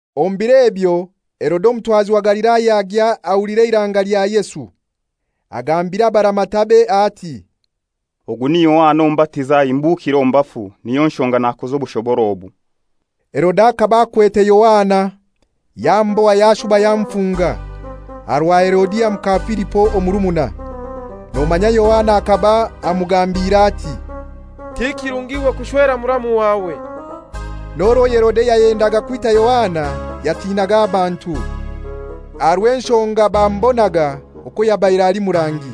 Omu biro ebyo Herode omutwazi wa Galilaya agya ahulira eiranga lya Yesu. Agambira abaramatabe ati, «Ogu ni Yohana Omubatiza, ahimbukire omu bafu; niyo nshonga nakoza obushobora obu.» Herode akaba akwete Yohana yamuboha yashuba yamufunga, aha rwa Herodia muka Filipo omurumuna. Nomanya Yohana akaba amugambiire ati, «Ti kirungi iwe kushwera muramu wawe.» N'orwo Herode yayendaga kwita Yohana, yatinaga abantu, aha rw'enshonga bamubonaga okwo yabaire ali murangi.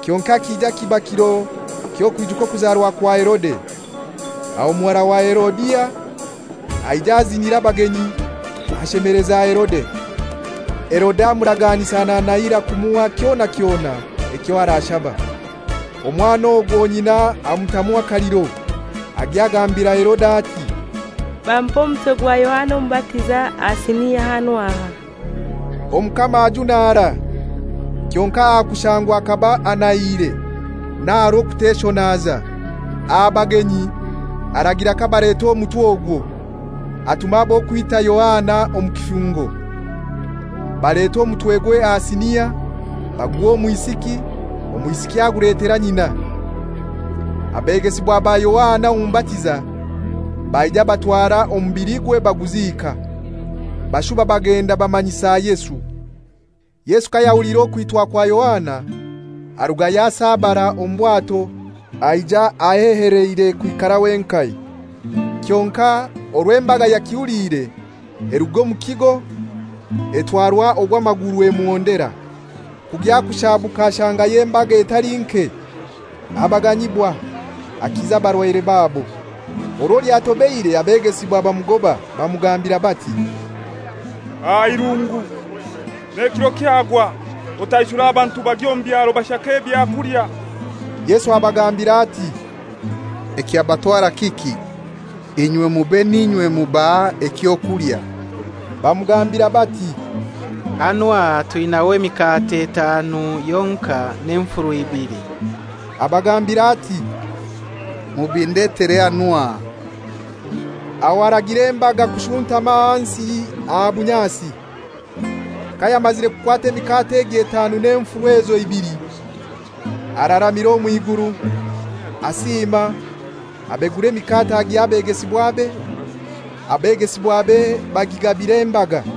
Kyonkai kija kiba kiro ky'okwijuka okuzarwa kwa Herode, aho muhara wa Herodia aija azinira abagenyi, ashemeleza Herode. Herode amuraganisa nanahira kumuha kyona kyona ekyo arashaba. Omwana ogwo nyina amutamu akaliro, agya agambira Herode ati, «Bampe omutwe gwa Yohana Omubatiza aha sinia hanu aha.» Omukama ajunara; kyonkai aha kushangwa akaba anahiire n'aha rw'okuteshonaza aha bagenyi aragira kabaleta omutwe ogwo. Atuma ab'okwita Yohana omu kifungo, baleta omutwegwe aha sinia, baguha omwisiki, omwisiki aguletera nyina. Abegesibwa ba Yohana Omubatiza baija batwara omubiligwe baguziika; bashuba bagenda bamanyisa Yesu. Yesu kayahuliire okwitwa kwa Yohana arugayo asabara omu bwato aija aheheleire kwikara wenkai. Kyonkai orwo embaga yakihuliire, eruga omu kigo etwarwa ogw'amaguru emuhondera. Kugya kushaabuka ashangayo embaga etali nke, abaganyibwa, akiza abarwaire babo. Orwo lyatobeire abegesibwa bamugoba bamugambira bati, «Aha irungu, n'ekiro kyagwa; otaishure abantu bagye omu byaro bashake ebyakulya.» Yesu abagambira ati, «Ekyabatwara kiki? Inywe mube n'inywe mubaha eky'okulya.» Bamugambira bati, «Hanu aha twinaho emikate etanu yonkai n'enfuru ibili.» Abagambira ati, «Mubindetere hanu aha.» Aho aragira embaga kushuntama ahansi aha bunyasi. Kayamazire kukwata emikate egyo etanu n'enfuru ezo ibili, araramira omw'iguru, asiima, abegura emikate agiha abegesibwabe, abegesibwa bagigabira embaga.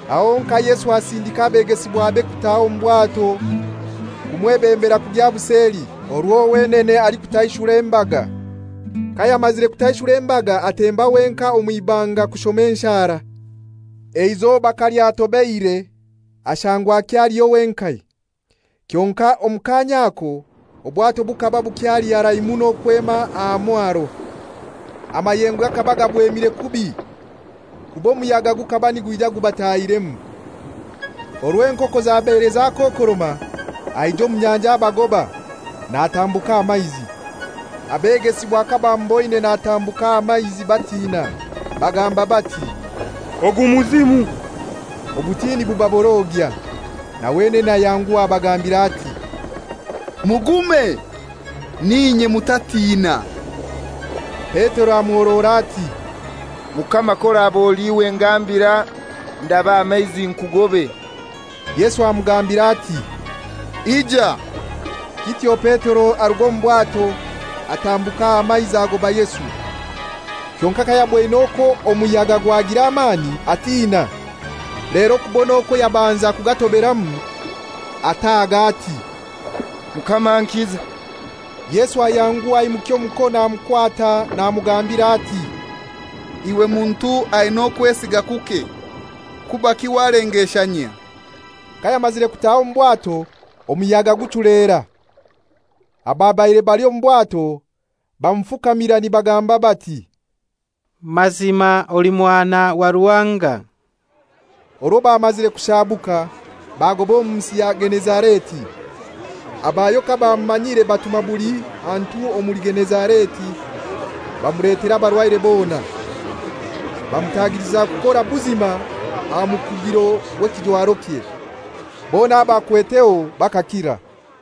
Aho honkai Yesu asindika abegesibwabe kutaha omu bwato kumwebembera kugya buseli, orwo wenene alikutaishura embaga. Kayamazire kutaishura embaga atemba wenkai omw'ibanga kushoma enshara. Eizoba kalyatobeire ashangwa akyaliyo wenkai; kyonkai omu kaanya ako obwato bukaba bukyali harai muno kwema aha mwaro. Amayengo gakaba gabwemire kubi kuba omuyaga gukaba nigwija gubatahiremu. Orwo enkoko zabaire zakokoroma aija omu nyanja abagoba, natambuka aha maizi. Abegesibwa kabamuboine natambukira aha maizi batina, bagamba bati, «Ogu muzimu!» Obutiini bubaborogya. Na wenene ayanguha abagambira ati, «Mugume, n'inye, mutatina.» Petero amuhorora ati, «Mukama k'oraba oli iwe ngambira ndabe aha maizi nkugobe.» Yesu amugambira ati, «Ija.» Kityo Petero aruga omu bwato, atambukira aha maizi agoba Yesu. Kyonkai kayaboine okwo omuyaga gwagira amani, atina; lero kubona okwo yabanza kugatoberamu, ataaga ati, «Mukama, nkiza.» Yesu ayanguha aimukya omukono amukwata namugambira ati, «Iwe muntu aina okwesiga kuke, kubaki walengeshanyia?» Kayamazire kutaha omu bwato omuyaga guchulera. Ababaire bali omu bwato bamufukamira nibagamba bati, «Mazima oli Mwana wa Ruhanga.» Orwo bamazire kushaabuka bagoba omu nsi ya Genezareti. Abayo kabamumanyire, batuma buli hantu omuli Genezareti bamuletera abarwaire bona. Bamutagiliza kukora buzima aha mukugiro gw'ekijwarokye. Bona abakweteho bakakira.